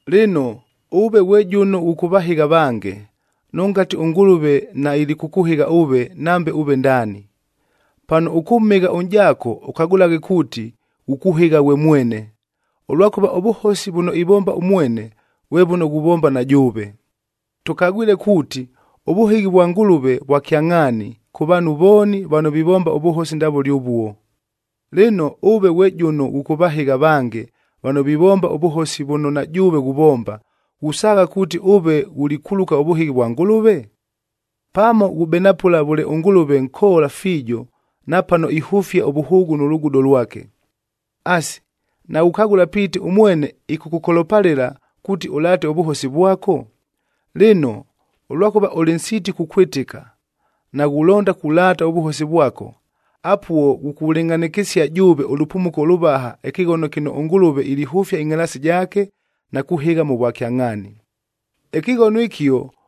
Lɨno, ʉve ghwe jʉno ghʉkʉvahɨgha avange, nʉngati ʉNgʉlʉve nailikʉkʉhɨgha ʉve, nambe ʉve ndaani. Pano ʉkʉmhɨgha ʉnʼjaako ʉkagʉlaghe kuuti, ghukuhɨgha ghwe mwene, ʉlwakʉva ʉvʉhosi vʉno ivomba ʉmwene, vwe vʉno ghuvomba na jʉʉve. Tʉkagwile kuuti, ʉvʉhɨghi vwa Ngʉlʉve vwa kyangʼhaani kʉ vaanhu vooni vano vivomba ʉvʉhosi ndavʉle ʉvuo. Lɨno, ʉve ghwe jʉno ghʉkʉvahɨgha avange vano vivomba ʉvʉhosi vʉno na jʉʉve ghuvomba, ghusaagha kuuti ʉve ghulikuluka ʉvʉhɨghi vwa Ngʉlʉve? Pamo ghubenapʉla vʉle ʉNgʉlʉve nkoola fiijo na pano ihʉfia ʉvʉhʉʉgʉ nʉ lugudo lwake. Asi, naghukagʉla piiti ʉmwene ɨkʉkʉkolopalɨla kuuti ʉlaate ʉvʉhosi vwako? Lɨno, ʉlwakʉva ʉlɨ nsiiti kukwɨtɨka, naghulonda kulaata ʉvʉhosi vwako, apuo ghukulɨngʼhanɨkɨsia jʉʉve ʉlʉpumuko ʉlʉvaha ɨkɨghono kɨno ʉNgʉlʉve ilihʉfia ɨngʼhalaasi jaake na kuhɨgha mʉ vwakyangʼhaani. Ɨkɨghono ɨkio,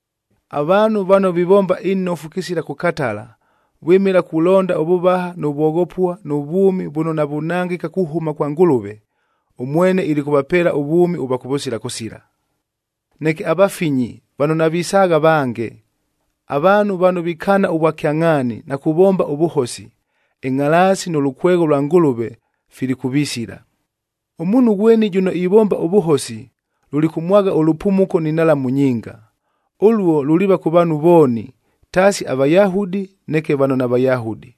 Avaanhu vano vivomba inofu kɨsila kʉkatala, vwɨmɨla kulonda ʉvʉvaha nʉ vwoghopua nʉ vwʉmi vʉno navunangɨka kuhʉma kwa Ngʉlʉve, ʉmwene ilikʉvapeela ʉvwʉmi ʉvwa kʉvʉsila kʉsila. Neke avafinyi vano navisaagha avange, avaanhu vano vikaana ʉvwakyangʼhaani na kuvomba ʉvʉhosi, ɨngʼhalaasi nʉ lʉkwegho lwa Ngʉlʉve filikʉvisila. Ʉmuunhu ghweni jʉno ivomba ʉvʉhosi lulikʉmwagha ʉlʉpumuko ni nhalamu nyinga. Ʉluo luliiva kʉ vaanhu vooni, taasi aVayahudi, neke vano naVayahudi.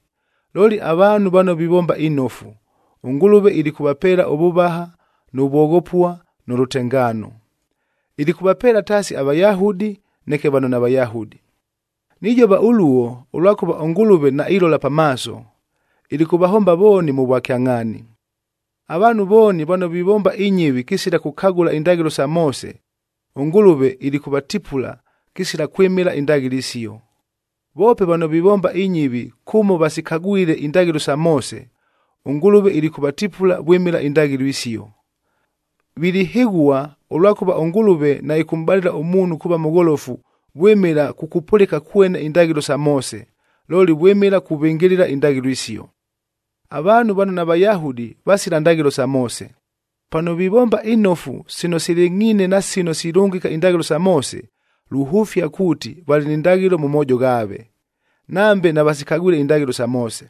Looli avaanhu vano vivomba inofu, ʉNgʉlʉve ilikʉvapeela ʉvʉvaha nʉ vwoghopua nʉ lʉtengaano. Ilikʉvapeela taasi aVayahudi, neke vano naVayahudi. Nijova ʉluo, ʉlwakʉva ʉNgʉlʉve nailola pa maaso, ilikʉvahomba vooni mʉ vwakyangʼhaani. Avaanhu vooni vano vivomba inyɨvi kɨsila kʉkagʉla indaghɨlo sa Moose, ʉNgʉlʉve ilikʉvatipula kɨsila kwɨmɨla indaghɨlo isio. Voope vano vivomba inyɨvi kʉmo vasikagwile indaghɨlo sa Moose, ʉNgʉlʉve ilikʉvatipula vwɨmɨla indaghɨlo isio. Vilihɨghua, ʉlwakʉva ʉNgʉlʉve naɨkʉmʼbalɨla ʉmuunhu kuuva mʉgholofu vwɨmɨla kukupʉlɨka kwene indaghɨlo sa Moose, looli vwɨmɨla kuvɨngɨlɨla indaghɨlo isio. Avaanhu vano naVayahudi vasila ndaghɨlo sa Moose. Pano vivomba inofu sino silɨngʼhiine na sino silʉngɨka indaghɨlo sa Moose, luhʉfia kuuti valɨ ni ndaghɨlo mʉ moojo ghaave, nambe navasikagwile indaghɨlo sa Moose.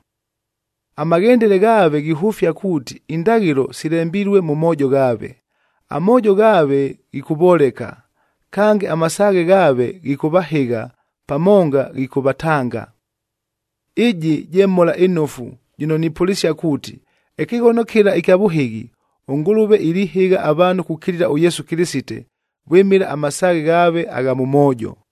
Amaghendele ghaave ghihʉfia kuuti indaghɨlo silembilue mʉ moojo ghaave.b Amoojo ghaave ghikʉvoleka, kange amasaaghe ghaave ghikʉvahɨgha pamonga ghikʉvatanga. Ɨjɨ je Mhola ɨNofu jɨno nipʉlɨsia kuuti, ɨkɨghono kɨla ɨkya vʉhɨghi, ʉNgʉlʉve ilihɨgha avaanhu kukilila ʉYesu Kɨlɨsite vwɨmɨla amasaaghe ghaave agha mʉ moojo.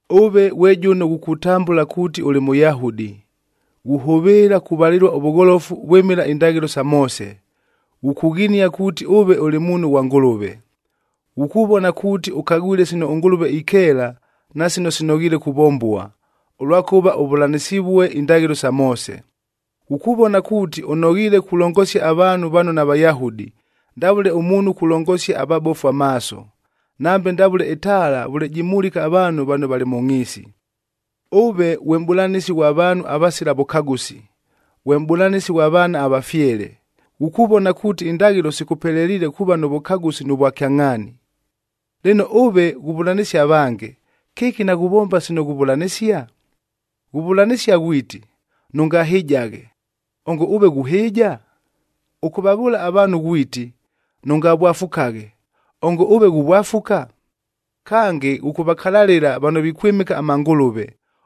Ʉve ghwe jʉno ghukutambʉla kuuti ʉlɨ Mʉyahudi, ghuhʉvɨɨla kuvalɨlua ʉvʉgholofu vwɨmɨla indaghɨlo sa Moose, ghukughinia kuuti ʉve ʉlɨ muunhu ghwa Ngʉlʉve. Ghukuvona kuuti ʉkagwile sino ʉNgʉlʉve ikeela na sino sinoghiile kuvombua, ʉlwakʉva ʉvʉlanɨsivue indaghɨlo sa Moose. Ghukuvona kuuti ʉnoghiile kulongosia avaanhu vano naVayahudi, ndavʉle ʉmuunhu kulongosia avabofu amaaso, nambe ndavʉle ɨtaala vʉle jimulika avaanhu vano valɨ mʉ ngʼhiisi. Ʉve ghwe mʼbʉlanɨsi ghwa vaanhu avasila vʉkagʉsi, ghwe mʼbʉlanɨsi ghwa vaana avafyele, ghukuvona kuuti indaghɨlo sikʉpeleliile kuuva nʉ vʉkagʉsi nʉ vwakyangʼhaani. Lɨno, ʉve ghuvʉlanɨsia avange, kɨki naghuvomba sino ghuvʉlanɨsia? Ghuvʉlanɨsia ghwiti, “Nʉngahɨjaghe!” Ongo ʉve ghuhɨɨja? Ʉkʉvavʉʉla avaanhu ghwiti, “Nʉngavwafukaghe!” Ongo ʉve ghuvwafuka? Kange, ghʉkʉvakalalɨla vano vikwɨmɨka amangʉlʉve,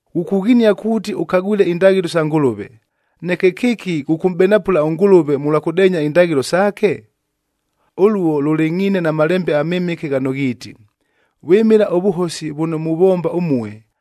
Ghukughinia kuuti ʉkagwile indaghɨlo sa Ngʉlʉve, neke kɨki ghʉkʉmʼbenapʉla ʉNgʉlʉve mʉlwa kʉdeenya indaghɨlo saake? Ʉluo lʉlɨngʼhiine na Malembe aMɨmɨke ghano ghiiti, “Vwɨmɨla ʉvʉhosi vʉno muvomba ʉmue,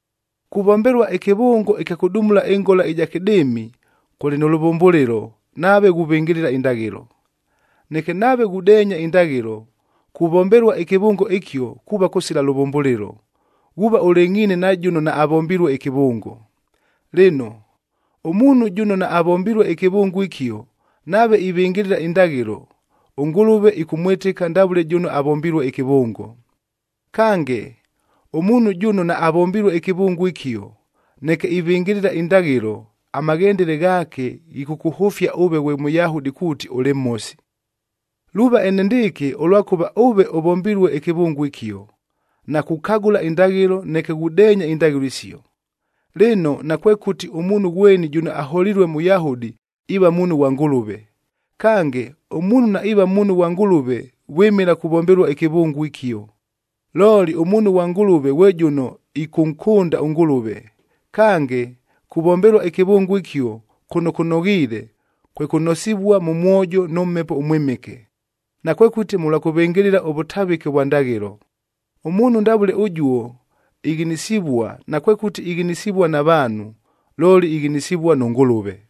Kuvombelua ɨkɨvʉngo ɨkya kʉdumulua ɨngola ɨja kɨdɨɨmi,e kʉlɨ nʉ lʉvʉmbʉlɨlo nave ghuvɨngɨlɨla indaghɨlo. Neke nave ghudeenya indaghɨlo, kuvombelua ɨkɨvʉngo ɨkio kuuva kʉsila lʉvʉmbʉlɨlo, ghuuva ʉlɨngʼhiine na jʉno naavombilue ɨkɨvʉngo. Lɨno, ʉmuunhu jʉno naavombilue ɨkɨvʉngo ɨkio nave ivɨngɨlɨla indaghɨlo, ʉNgʉlʉve ɨkʉmwɨtɨka ndavʉle jʉno avombilue ɨkɨvʉngo. Kange, ʉmuunhu jʉno naavombilue ɨkɨvʉngo ɨkio, neke ivɨngɨlɨla indaghɨlo, amaghendele ghaake ghikʉkʉhʉfia ʉve ghwe Mʉyahudi kuuti ʉlɨ mhosi. Luuva enendɨɨkɨ, ʉlwakʉva ʉve ʉvombilue ɨkɨvʉngo ɨkio, na kukagʉla indaghɨlo, neke ghudeenya indaghɨlo isio. Lɨno, nakwekʉti ʉmuunhu ghweni jʉno aholilue Mʉyahudi iiva muunhu ghwa Ngʉlʉve. Kange, ʉmuunhu naiiva muunhu ghwa Ngʉlʉve vwɨmɨla kuvombelua ɨkɨvʉngo ɨkio. Looli ʉmuunhu ghwa Ngʉlʉve ghwe jʉno ɨkʉnkʉnda ʉNgʉlʉve. Kange, kuvombelua ɨkɨvʉngo ɨkio kʉno kʉnoghiile, kwe kʉnosivua mʉ mwojo nʉ Mhepo ʉMwɨmɨke, nakwekʉti mʉlwa kʉvɨngɨlɨla ʉvʉtavɨke ʉvwa ndaghɨlo. Ʉmuunhu ndavʉle ʉjuo ighinisivua, nakwekʉti ighinisivua na vaanhu, looli ighinisivua nʉ Ngʉlʉve.